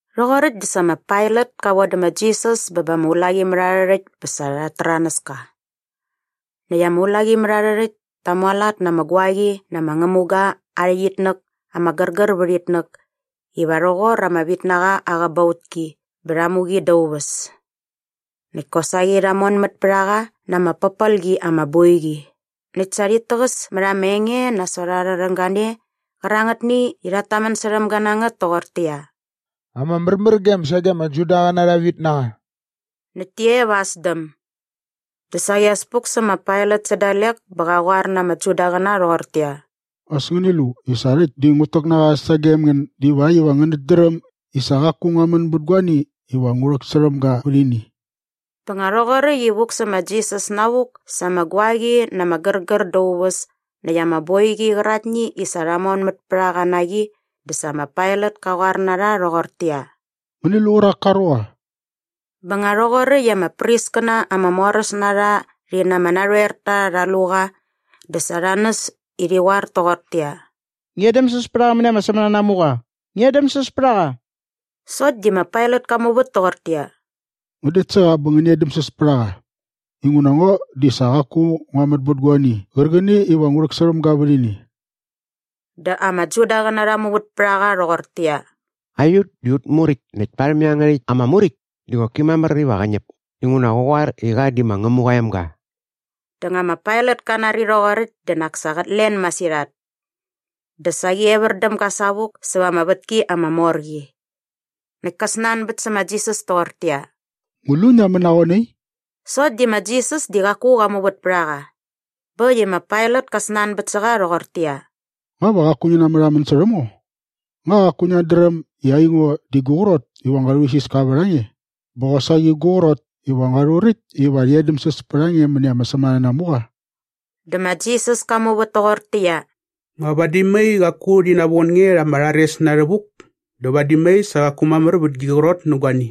Rhoqoräkt dä sa ma Pailat ka vodä ma Jisas bä ba ama ulaqimärharhärhäkt bä sa rhat täranäs ka. Näkt ama ulaqimärharhärhäkt ta mualat na ama guaqi na ama ngämuga aa rhäqyitnäk ama gärgär vät itnäk iva rhoqor ama vitnaqa aa qäbautki bä rha mu qi dä aa uväs. Näkt kosaqi rha monmät pät a qa na ama pärpel qi ama boiqi näkt sa rhit täqäs mät ama enge nasot arha rhäng gane qärangätni i rhat tamän särhäm ga na ngät toqortäqyia, “Ama märmärgem sage ama Judaqäna arha vitnaqa!” Näkt ti e va aa sdäm. Dä saqi as puk sä ma Pailat sä dalek bä qa qoar na ama Judaqäna rhoqortäqyia, “As ngäni lu i sa rhäkt di ngut täk na qa sagem ngän divakt iva ngänät dräm i sa qaku ngua män bät guani iva ngu rhäksärhäm ga vät ini.” Bä nga rhoqoräkt i vuk sä ma Jisas navuk sa ama guaqi na ama gärgär da aa uväs näkt ama boiqi qäraktni i sa rha monmät pät a qa na qi dä sa ma Pailat ka qoar na rha rhoqortäqyia, “Ngäni lu qärak ka ruqa.” Bä nga rhoqoräkt i ama priskäna ama moräs na rha rhi na ama narhoerta rha lu qa dä sa rha näs i rhi qoar toqortäqyia, “Ngi edämsäs pät a qa mäni ama sämänanamuqa! Ngi edämsäs pät a qa!” Sokt di ma Pailat ka muvät toqortäqyia, “Ngän det sä qa bä ngäni edämsäs pät a qa. Inguna ngo di sa qaku ngua män bät guani qärqäni iva ngu rhäksärhäm ga vät ini.” Dä ama Judaqäna rha muvät pät a qa rhoqortäqyia, “Aiut di aut muräkt näkt parhäm iangärhäkt ama muräkt di qoki mamär iva qä ñäp inguna qä qoar i qa di ma Ngämuqa aa emga.” Bä nga ma Pailat ka nari rhoqoräkt dä nak sa qät len masirhat. Dä saqi evär däm ga savuk säva ama vätki ama mor qi. Näkt ka snanbät sä ma Jisas toqortäqyia, “Ngu lu ngia män na qoe nai?” Sokt di ma Jisas di qaku qa muvät pät a qa. Bä äkt i ma Pailat ka snanbät sä qa rhoqortäqyia, “Nga va qaku ngi namärhamän särhäm ngo? Nga qaku ngiat dräm i aingo di gu qrot iva ngua rhuisiska vät a nge bä qosaqi gu qrot iva ngua rhuräkt iva rhi edämsäs pät a nge mäni ama sämänanamuqa?” Dä ma Jisas ka muvät toqortäqyia, “Nga vadi mai qaku rhi navon nge rha ama rhares na rhävuk dä vadi mai sa qaku mamär vät gi qrot nä guani.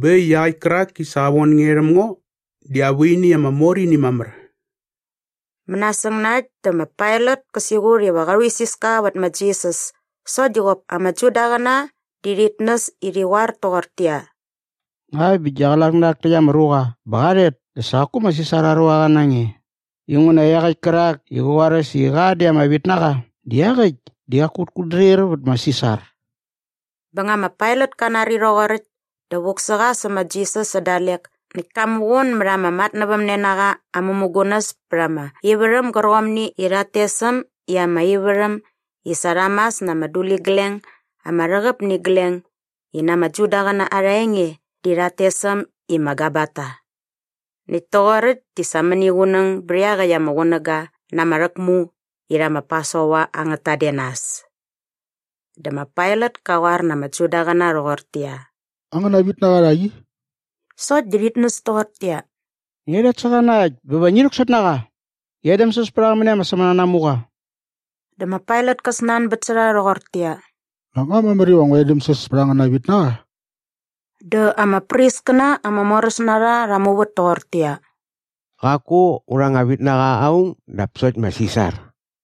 Bä äkt i iaqäkt kärak i sa qa von nge rhäm ngo di aa vuini ama mor ini mamär.” Mänasäng na äkt dä ma Pailat kä siqut iva qa rhuisiska vät ma Jisas sokt di qop ama Judaqäna di rhit näs i rhi qoar toqortäqyia, “Ngakt bä gia qlak nä rhak täkt ama ruqa bä qa rhet dä sa qaku ma Sisar aa ruaqa na nge inguna iaqäkt kärak i qä qoaräs i qa di ama vitnaqa di iaqäkt di qaku qät kutdrir vät ma Sisar.” Bä nga ma Pailat ka nari rhoqoräkt dä vuk sä qa sä ma Jisas sä dalek näkt ka muqun mät ama matnävämnenaqa aa mämugunäs pät ama ivärhäm gärqomni i rhat tes äm i ama ivärhäm i sa rha mas na ama duligleng ama rhäqäp nä igleng i na ama Judaqäna arha enge di rhat tes äm i ma Gabata. Näkt toqoräkt di sa mäniqunäng bät iaqäkt ama qunäga na ama rhäkmu irhä ma Pasova angät tadenas. Dä ma Pailat ka qoar na ama Judaqäna rhoqortäqyia, “Angäna vitnaqa rhak i.” Sokt di rhit näs toqortäqyia, “Ngia rhet sä qa na äkt bä va ngi rhäksot na qa! Ngi edämsäs pät a qa mäni ama sämänanamuqa!” Dä ma Pailat ka snanbät sä rha rhoqortäqyia, “Nak nga mamär iva ngu edämsäs pät angäna vitnaqa?” Dä ama priskäna ama moräs na rha rha muvät toqortäqyia, “Qaku aurha anga vitnaqa aung dap sokt ma Sisar.”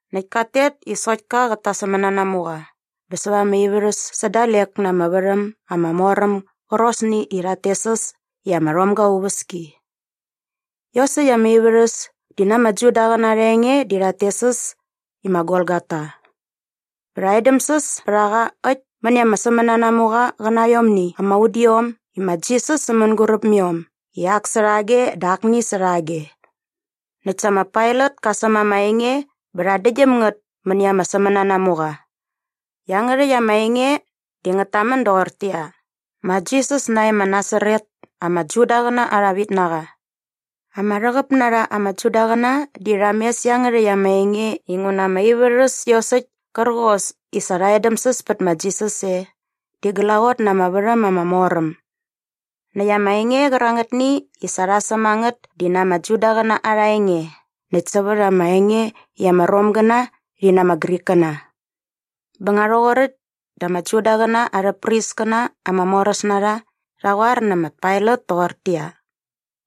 näkt kat tet i sokt ka qät ta aa sämänanamuqa bä säva ama ivärhäs sä dalek na ama värhäm ama mor äm gärqosni i rhat tes äs i ama rhomga aa uväski. Iosäkt ama ivärhäs di na ama Judaqäna arha enge di rhat tes äs i ma Golgota. Bä rha edämsäs pät a qa äkt mäni ama sämänanamuqa qä na aiomni ama udiom i ma Jisas sä mänguräp mä iom i ak särhage dä akni särhage. Näkt sa ma Pailat ka säm ama enge bä rha däktgyäm ngät mäni ama sämänanamuqa. Iangärhäkt ama enge di ngät tamän doqortäqyia, “Ma Jisas nae ma Nasaret, ama Judaqäna arha vitnaqa.” Ama rhäqäp na rha ama Judaqäna di rha mes iangärhäkt ama enge inguna ama ivärhäs iosäkt kärqos i sa rha edämsäs pät ma Jisas e di glaqot na ama värhäm ama mor äm. Näkt ama enge qärangätni i sa rha säm a ngät di na ama Judaqäna arha enge näkt sävät ama enge i ama Romgäna rhi na ama Grikkäna. Bä nga rhoqoräkt dä ama Judaqäna arhä priskäna ama moräs na rha rha qoar nä ma Pailat toqortäqyia,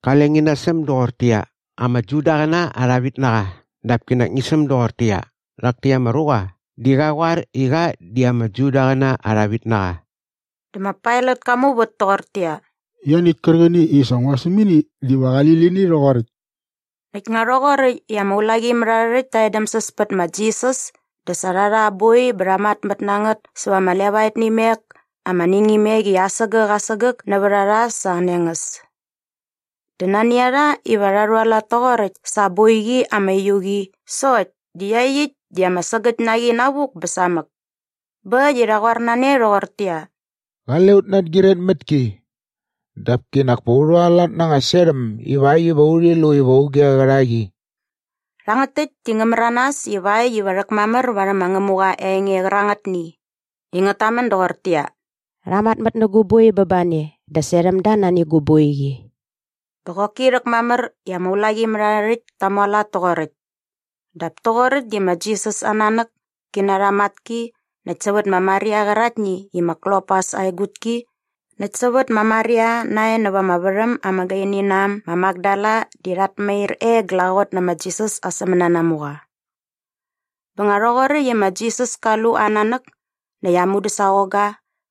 “Qale ngi nasäm doqortäqyia, ‘Ama Judaqäna arha vitnaqa’ dap kinak ngi säm doqortäqyia, ‘Rhak täkt ama ruqa di qa qoar i qa di ama Judaqäna arha vitnaqa.’” Dä ma Pailat ka muvät toqortäqyia, “Ianiäkt kärqäni i sa ngua säm ini diva qali lini rhoqoräkt.” Näkt nga rhoqoräkt i ama ulaqimärharhärhäkt ta edämsäs pät ma Jisas dä sa rha rha aa boi bä rha matmät na ngät sävät ama levaet nä imek ama ningimek i asägäk asägäk nävät a rha sa aa nengäs. Dä nani a rha iva rha rhualat toqoräkt sa aa boiqi ama uiu qi sokt di iaqyäkt di ama sägäkt na qi navuk bä samäk. Bä äkt i rha qoar na ne rhoqortäqyia, “Qale ut nangyiret mät ki. Dap kinak pa u rhualat na anga serhäm ivakt iva urhi lu iva auge qä rha qi.” Rhangät täkt di ngä märanas ivakt iva rhäkmamär varhäm ma Ngämuqa aa enge qärangätni i ngät tamän doqortäqyia, “Rha matmät nä gu boi bä ba ne dä serhäm da nani gu boiqi.” Bä qoki rhäkmamär i ama ulaqimärharhärhäkt ta mualat toqoräkt. Dap toqoräkt di ma Jisas aa nanäk ki na arha matki näkt sävät ma Maria qäraktni i ma Klopas aa egutki näkt sävät ma Maria nae näva ama värhäm ama gaini na äm ma Makdala di rhat mair e glaqot nä ma Jisas aa sämänanamuqa. Bä nga rhoqoräkt i ma Jisas ka lu aa nanäk näkt aa mudäsaqongga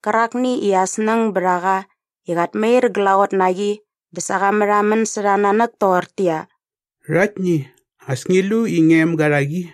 qärakni i aa snäng bät a qa i qat mair glaqot na qi dä sa qa märhamän särha aa nanäk toqortäqyia, “Rhaktni, as ngi lu i ngia emga rhak i.”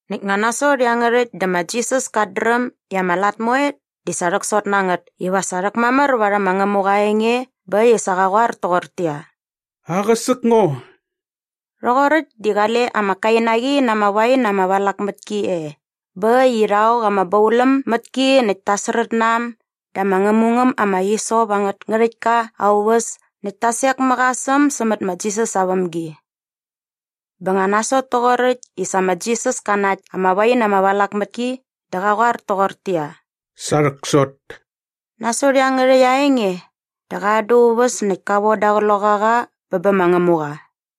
Näkt nga nasot iangärhäkt dä ma Jisas kat dräm i ama lat moe di sa rhäksot na ngät iva sa rhäkmamär varhäm ma Ngämuqa aa enge bä äkt i sa qa qoar toqortäqyia, “Aqäsäk ngo.” Rhoqoräkt di qale ama kainaqi na ama wain ama valak mät ki e bä äkt i rha ok ama bauläm mät ki näkt ta srät na äm da ama ngämungäm ama hisop angät ngärhäktka aa uväs näkt ta sek mä qa sä äm sämät ma Jisas aa vämgi. Bä nga nasot toqoräkt i sa ma Jisas ka nakt ama wain ama valak mät ki dä qa qoar toqortäqyia, “Sa rhäksot.” Nasot iangärhäkt aa enge dä qa an da aa uväs näkt ka voda aa qloqaqa bä bä ma Ngämuqa.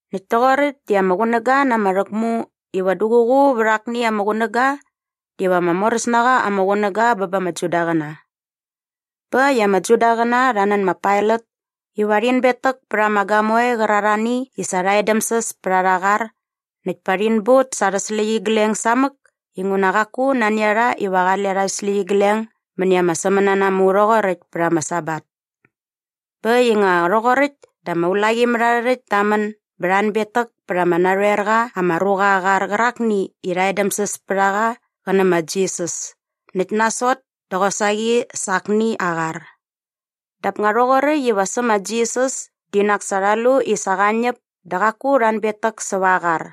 Näkt toqoräkt di ama qunäga na ama rhäkmu iva duququ vät akni ama qunäga diva ama moräs na qa ama qunäga bä ba ama Judaqäna. Bä äkt i ama Judaqäna rha nän ma Pailat iva rhin betäk pät ama gamoe qärarhani i sa rha edämsäs pät a rha arha qar näkt pa rhin but sa arhä släqyigleng samäk inguna qaku nani a rha iva qale arhä släqyigleng mäni ama sämänanamu rhoqoräkt pät ama Sabat. Bä äkt i nga rhoqoräkt dä ama ulaqimärharhärhäkt ta män bä rha anbetäk pät ama narhoer qa ama ruqa aa qar qärakni i rha edämsäs pät a qa qä nä ma Jisas näkt nasot dä qosaqi sa akni aa qar. Dap nga rhoqoräkt iva sä ma Jisas di nak sa rha lu i sa qa ñäp dä qaku rha anbetäk säva aa qar.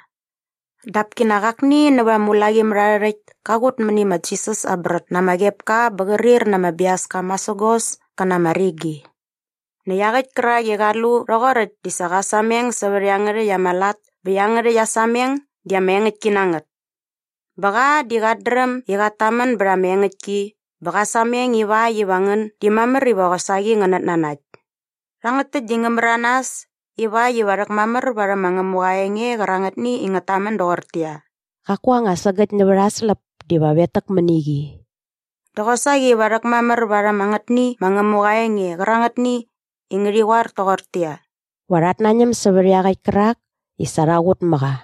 Dap kinak akni nävät ama ulaqimärharhärhäkt ka qut mäni ma Jisas aa brät na ama qepka bä qärir na ama biaska masägos kä na ama rigi. Näkt iaqäkt kärak i qa lu rhoqoräkt di sa qa sameng sävät iangärhäkt ama lat bä iangärhäkt aa sameng di ama engäktki na ngät. Bä qa di qat dräm i qat tamän bät ama engäktki bä qä sameng iväkt iva ngän di mamär iva qosaqi ngänät nanakt. Rhangät täkt di ngä märanas ivakt iva rhäkmamär varhäm ma Ngämuqa aa enge qärangätni i ngät tamän doqortäqyia, “Qaku anga sägäkt nävät aa släp diva vetäk mäni qi” dä qosaqi va rhäkmamär varhäm angätni ma Ngämuqa aa enge qärangätni i ngärhi qoar toqortäqyia, “Va rhat nañäm sävät iaqäkt kärak i sa rha qut mä qa.”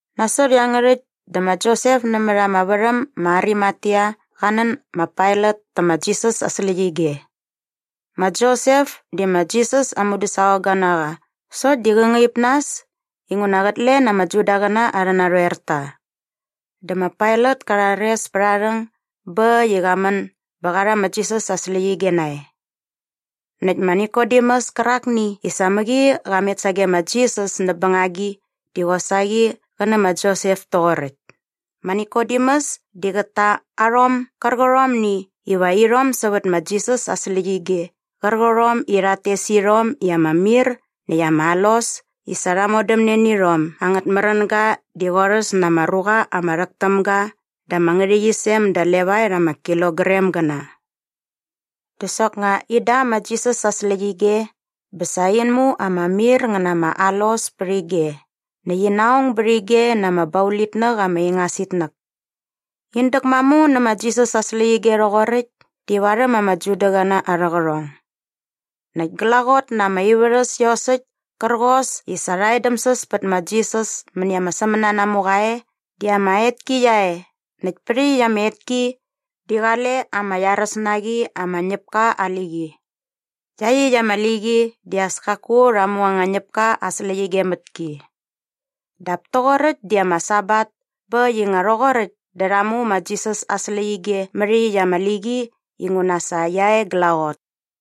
Nasot iangärhäkt dä ma Josep nämät ama värhäm ma Arimatea qa nän ma Pailat tä ma Jisas aa släqyige. Ma Josep di ma Jisas aa mudäsaqongga na qa sokt di qä ngaip nas inguna qät len ama Judaqäna arhä narhoerta. Dä ma Pailat ka rhares pät aa rhäng bä äkt i qa män bä qa rha ma Jisas aa släqyige nae. Näkt ma Nikodemus kärakni i sa mäqi qa met sage ma Jisas näp bängagi di qosaqi qä nä ma Josep toqoräkt. Ma Nikodemus di qät ta arhom gärqärhomni iva irhom sävät ma Jisas aa släqyige qärqärhom i rhat tes irhom i ama mir näkt ama alos i sa rha modämne nä irhom angät märänga di qorhäs na ama ruqa ama rhäk täm ga da ama ngärhäqyisem da levaet ama kilogramgäna. Dä soknga in da ma Jisas aa släqyige bä sa in mu ama mir ngä na ama alos pät ige näkt ina ong bät ige na ama baulitnäk ama ingas itnäk. In däkmamu nä ma Jisas aa släqyige rhoqoräkt di varhäm ama Judaqäna arhä qärhong. Näkt glaqot na ama ivärhäs iosäkt kärqos i sa rha edämsäs pät ma Jisas mäni ama sämänanamuqa e di ama etki qia e näkt pät iaqyäkt ama etki di qale ama iaräs na qi ama ñäpka aa liqi. Iaqyäkt ama liqi di as kaku rha mu anga ñäpka aa släqyige mät ki. Dap toqoräkt di ama Sabat bä äkt i nga rhoqoräkt dä rha mu ma Jisas aa släqyige mät iaqyäkt ama liqi inguna sa qia e glaqot.